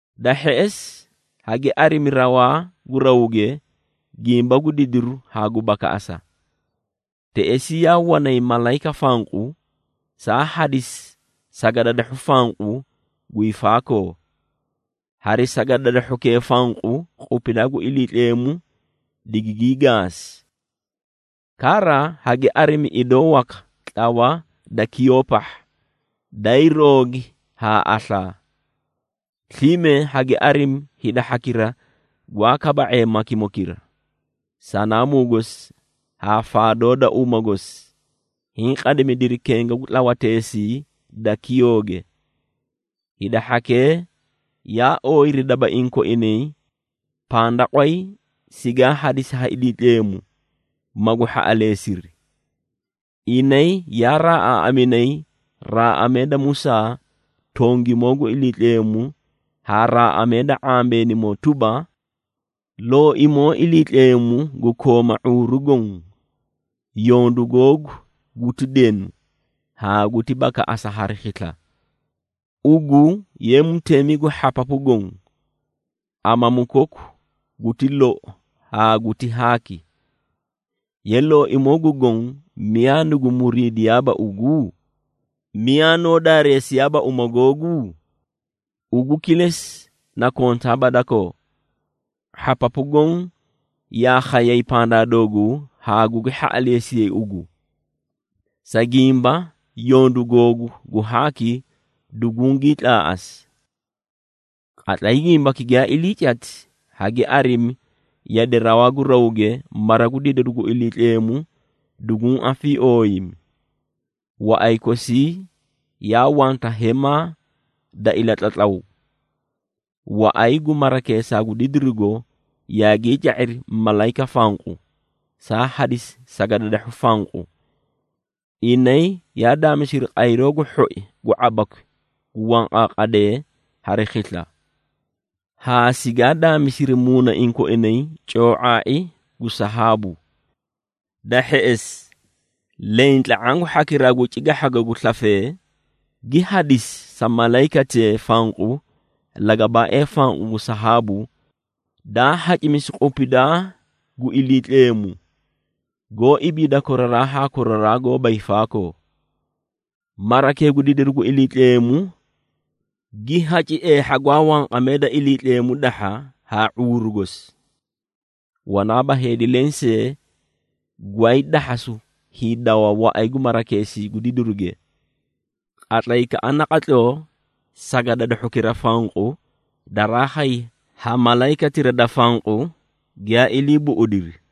Da hheꞌesi, hagi arimi rawaa gu rawge, gimba gu didiru haa gu bakaꞌasu. Teꞌesii yaa wanay malayika fanqu, saa hadisi sagadadahhu fanqu guyii faakoo. Hari sagadadahhukee fanqu, qupidaa gu Iliitleemu digingii gaasi. Kara hagi arimi idoo waka tlawa da kiyoo pahha, daay roogi haa aslaa. Slime hagi arimi hida hhakira gwaa kaba⁄ee makimokira, sanaamuu gosi haa faadoo da uma gosi, hiĩ qadimidiri kenga gu tlawateesii da kiyooge. Hida hhakee yaa ooyiri dabaiĩ koinay pandaqway sigaa hadisi ha Iliitleemu, magu hhaꞌaleesiri. Inay yaa raaꞌaaꞌaminay raaꞌamee da Musaa tongimoo gu Iliitleemu haa raaꞌamee da ⁄ambeenimoo tuba, “Looimoo Iliitleemu gu kooma ⁄uuru goõ, yondu googu guti denu haa guti bakaꞌasa hari khisla! Ugu ye Mutemi gu hhapapu goõ, Amamu koku guti loi haa guti haaki! Ye Looimoo gu Goõ, miyaa nugu muriidiyaaba ugu? Miyaa noó daareesiyaaba uma googu? Ugu kilesi na kontaaba dakoo. Hhapapu goõ yaa khayay pandaa dooguu, haa gugi hhaꞌaleesiyay ugu, sa gimba yondu googu gu haaki dugungii tlaaꞌasi.” Qatlay gimbaki giyaa ilii cati, hagi arimi yade rawaa gu rawge, mara gu didiru gu Iliitleemu duguũ afiiooyimi, waꞌay kosii yaa wanta hemaa da ilatlatlaw. Waꞌay gu marakeesaa gu didirugo yaagii ca⁄iri malayika fanqu, saa hadisi sagadadahhu fanqu. Inay yaa daamisiri qayroo gu hhoi gu ⁄abakwi gu wanqaaqadee hari khisla, haa sigaa daamisiri muunaiĩ koinay coo⁄aai gu sahaabu. Da hheꞌesi, leẽ tla⁄aã gu hhakiraa cigahhago gu slafee, gi hadisi sa malayikatee fanqu lagabaaee fanqu gu sahaabu, daa hacimisi qupidaa gu Iliitleemu, goó ibiida koraraa haa koraraa goóba hiifaakoo. Marakee gu didiru gu Iliitleemu, gi haci eehha gwaa wanqamee da Iliitleemu dahha haa ⁄uuru gosi. Wanaaba heedi leẽ see gwaay dahhasu hiidawa waꞌay gu marakeesii gu didiruge, qatlaykaꞌa naqatloo sagadadahhukira fanqu daraa khay ha malayikatira da fanqu giyaa ilii buꞌudiri.